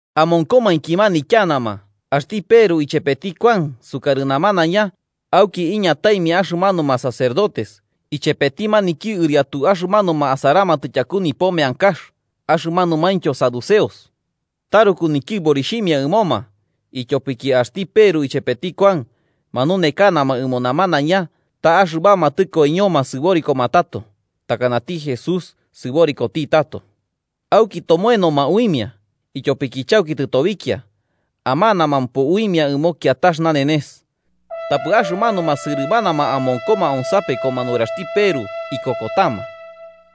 Amonkomainki manityanama axti Peru ichepeti Kuan sukarɨ namanaiña, auki iñataimia axɨmanuma sacerdotes, ichepeti maniki ɨriatu axɨmanuma asaramatɨ tyaku nipo meankax axɨmanumaintyo saduceos. Taruku nityɨborixhimia ɨmoma, ityopiki axti Peru chepeti Kuan manunekanama ɨmo namanaiña ta axɨbama tɨkoiñoma sɨborikoma tato, takanati Jesús sɨborikoti tato. Auki tomoenoma uimia, ityopiki chauki tɨtobikia, amanamampo uimia ɨmo kiatax nanenes. Tapɨ axɨmanuma sɨrɨmanama amonkoma onsapekoma nuraxti Peru, ikokotama.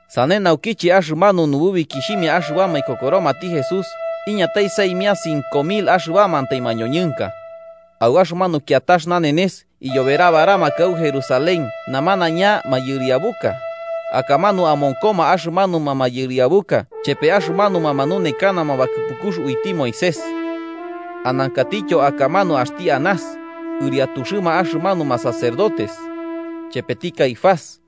Sane naukiche axɨmanu nububikixhimia axɨbama ikokoromati Jesús, iñatai saimia cinco mil axɨbamantai mañoñɨnka. Au axɨmanu kiatax nanenes iyoberabaramakɨ au Jerusalén namanaiña mayɨriabuka, akamanu amonkoma axɨmanuma mayɨriabuka chepe axɨmanuma manunekanama bakɨpukux uiti Moisés. Anankatityo akamanu axti Anás, ɨriatuxɨma axɨmanuma sacerdotes, chepeti Caifás,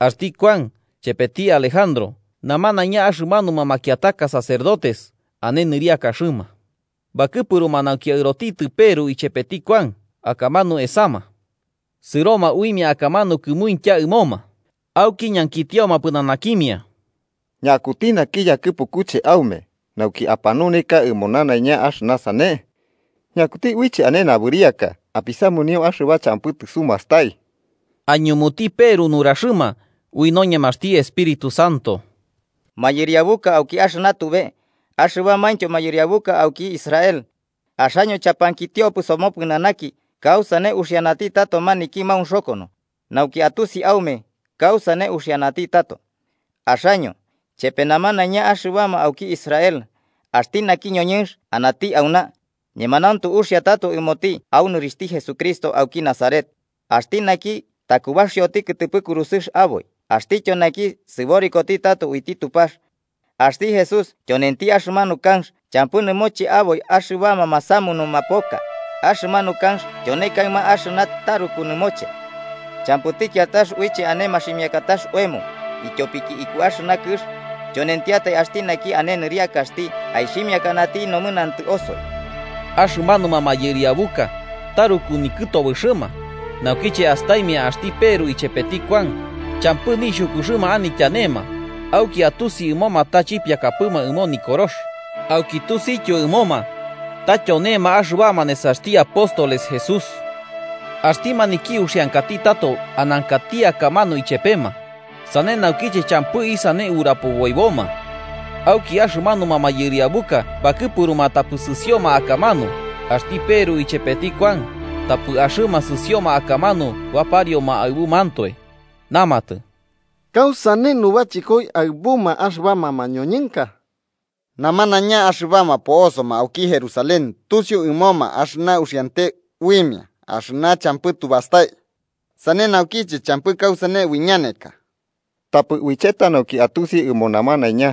axti Kuan chepeti Alejandro namanaiña axɨmanuma makiataka sacerdotes ane nɨriakaxɨma. Bakɨpuruma nauki aɨrotitɨ Peru ichepeti Kuan akamanu esama. Sɨroma uimia akamanu kɨmuintya ɨmoma, auki ñankitioma pɨnanakimia: –¿Ñakuti naki yakɨpukuche aume, nauki apanuneka ɨmo namanaiña axɨna sane? ¿Ñakuti uiche ane nabɨriaka apisamunio axɨba champɨ tɨsumastai? Aiñumuti Peru nuraxɨma ui noñemaxti Espíritu Santo: –Mayɨriabuka auki axɨna tube axɨbamaintyo mayɨriabuka auki Israel: axaño chapankitiopɨ somopɨnanaki kausane uxianati tato maniki maunxokono, nauki atusi aume kausane uxianati tato. Axaño, chepe namanaiña axɨbama auki Israel, axti naki ñoñɨnx anati auna, ñemanauntu uxia tato ɨmoti au nɨrixhti Jesucristo auki Nazaret, axti naki takubaxioti kɨtɨpɨ kurusɨx aboi axtityo naki sɨborikoti tato uiti Tupax. Axti Jesús tyonenti axɨmanu kanx champɨ nɨmoche aboi axɨbama masamunuma poka, axɨmanu kanx tyone kaɨma axɨna taruku nɨmoche. Champɨti kiatax uiche ane maximiakatax oemo, ityopiki iku axɨna kɨx, tyonentiatai axti naki ane nɨriakaxti aixhimiakati nomɨnantɨ osoi. Axɨmanuma mayɨriabuka taruku nikɨtobɨxɨma naukiche astaimia axti Peru ichepeti Kuan, champɨ nixhukuxɨma anityanema, auki atusi ɨmoma ta chipiakapɨma ɨmo Nikorox, auki tusityo ɨmoma, ta tyonema axɨbama nesaxti apóstoles Jesús. Axti maniki uxiankati tato anankati akamanu ichepema, sane naukiche champɨ isane urapoboiboma. Auki axɨmanuma mayɨriabuka bakɨpuruma tapɨ sɨsioma akamanu axti Peru ichepeti Kuan, tapɨ axɨma sɨsioma akamanu baparioma aɨbumantoe. Namatɨ: –¿Kausane nubachɨkoi aɨbuma axɨbama mañoñɨnka? Namanaiña axɨbama po'osoma auki Jerusalén tusiu ɨmoma axɨna uxiante uimia axɨna champɨ tubastai. Sane naukiche champɨ kausane uiñaneka. Tapɨ uicheta nauki atusi ɨmo namanaiña,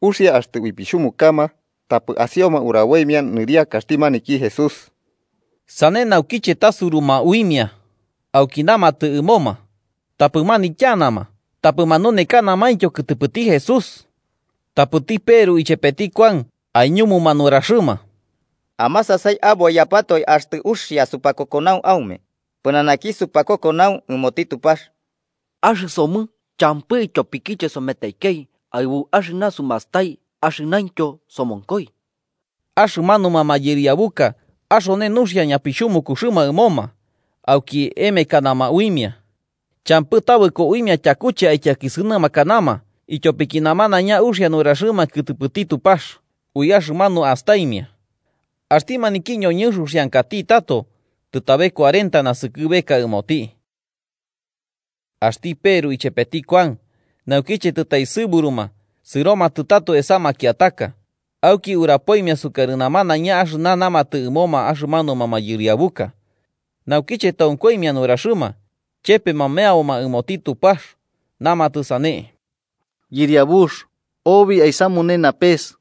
uxia axtɨ uipixhumukama, tapɨ asioma uraboimia nɨriakaxti maniki Jesús. Sane naukiche tasuruma uimia, auki namatɨ ɨmoma tapɨ manityanama tapɨ manunekanamaintyo kɨtɨpɨti Jesús. Tapɨti Peru ichepeti Kuan aiñumuma nuraxɨma: –Amasasai aboiyapatoe axtɨ uxia supakokonau aume, pɨnanaki supakokonau ɨmoti Tupax. Axɨsomɨ champɨ ityopikiche someteikei aɨbu axɨna sumastai axɨnaintyo somonkoi. Axɨmanuma mayɨriabuka axone nuxia ñapixhumukuxɨma ɨmoma, auki emekanama uimia. Champɨ tabɨko uimia tyakuche aityakisɨnɨmakanama ityopiki namanaiña uxia nuraxɨma kɨtɨpɨti Tupax ui axɨmanu astaimia. Axti maniki ñoñɨnx uxiankati tato, tɨtabe cuarenta naskɨbeka ɨmoti. Axti Peru ichepeti Kuan, naukiche tɨtaesɨburuma, sɨromatɨ tato esa makiataka, auki urapoimia sukarɨma nanaiña axɨna namatɨ ɨmoma axɨmanuma mayɨriabuka. Naukiche tonkoimia nuraxɨma, chepema meaboma ɨmoti Tupax, namatɨ sane: “Yɨriabux, obi aisamune napes,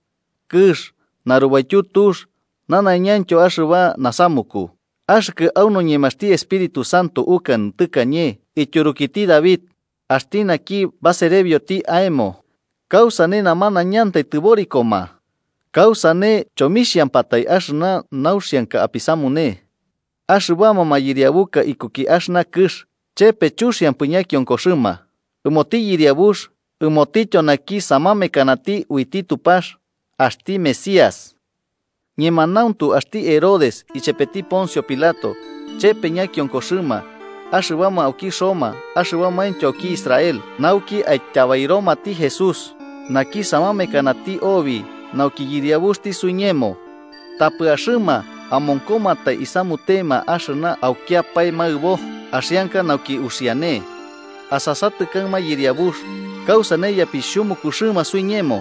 kɨx, narubaityu tux nanaiñaintyo axɨba nasamuku, axɨkɨ au noñemaxti Espíritu Santo ukanɨ tɨkañe ityurukiti David, axti naki baserebioti aemo: ‘¿Kausane namanaiñantai tɨborikoma? ¿Kausane chomixhampatai axɨna nauxianka apisamune? Axɨbama mayɨriabuka ikuki axɨna kɨx, chepe chuxiampɨ ñakionkoxɨma, ɨmoti Yɨriabux ɨmotityo naki samamekanati uiti Tupax, axti Mesías.’ “Ñemanauntu axti Herodes ichepeti Poncio Pilato chepe ñakionkoxɨma, axɨbama auki Roma axɨbamaintyo auki Israel, nauki aityabairomati Jesús, naki samamekanati obi nauki yɨriabuxti suiñemo. Tapɨ axɨma amonkomantai isamutema axɨna aukiapae maɨbo, axianka nauki uxiane. Asasatɨ kaɨma Yɨriabux, kausane ñapixhumukuxɨma suiñemo.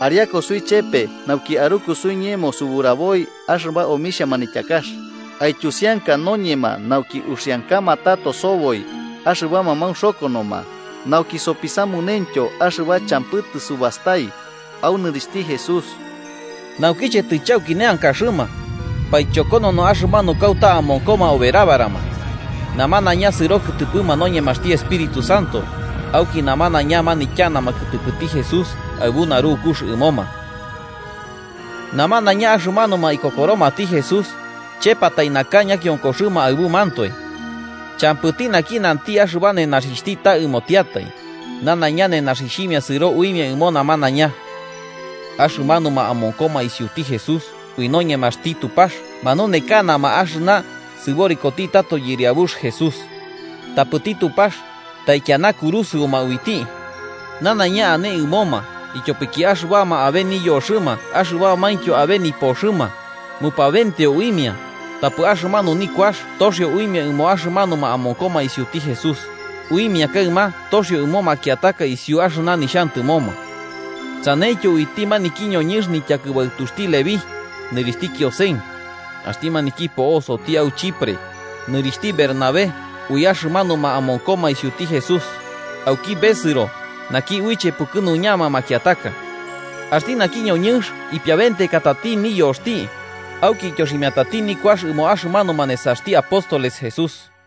Ariaku suichepe nauki aruku suiñemo suburaboi axɨba omixhia manityakax. Aityusianka noñema nauki uxiankama tato soboi axɨbama maunxokonoma, nauki sopisamunentyo axɨba champɨ tɨsubastai au nɨrixhti Jesús.” Naukiche tɨchauki neankaxɨma, paichokonono axɨmanu kauta amonkoma oberabarama. Namanaiña sɨro kɨtɨpɨma noñemaxti Espíritu Santo, auki namanaiña manityanama kɨtɨpɨti Jesús aɨbu narukux ɨmoma. Namanaiña axɨmanuma ikokoromati Jesús, chepatai naka ñakionkoxɨma aɨbumantoe. Champɨti naki nanti axɨba nenaxixhti ta ɨmotiatai, nanaiña nenaxixhimia sɨro uimia ɨmo namanaiña. Axɨmanuma amonkoma isiuti Jesús ui noñemaxti Tupax manunekanama axɨna sɨborikoti tato Yɨriabux Jesús. Tapɨti Tupax taikiana kurusɨuma uiti, nanaiña ane ɨmoma, ityopiki axɨbama abe niyoxɨma axɨbamaintyo abe nipoxɨma, mupabenteo uimia, tapɨ axɨmanu nikuax toxio uimia ɨmo axɨmanuma amonkoma isiuti Jesús, uimia kaɨma toxio ɨmo makiataka isiu axɨna nixhantɨmoma. Saneityo uiti maniki ñoñɨnx nityakɨbaɨtuxti Leví, nɨrixhti Kiosen, axti maniki po'osoti au Chipre, nɨrixhti Bernabé ui axɨmanuma amonkoma isiuti Jesús, (auki besɨro “Naki uiche pukɨnuñama makiataka”). Axti naki ñoñɨnx ipiabentekatati niyoxti, auki ityoximiatati nikuax ɨmo axɨmanuma nesaxti apóstoles Jesús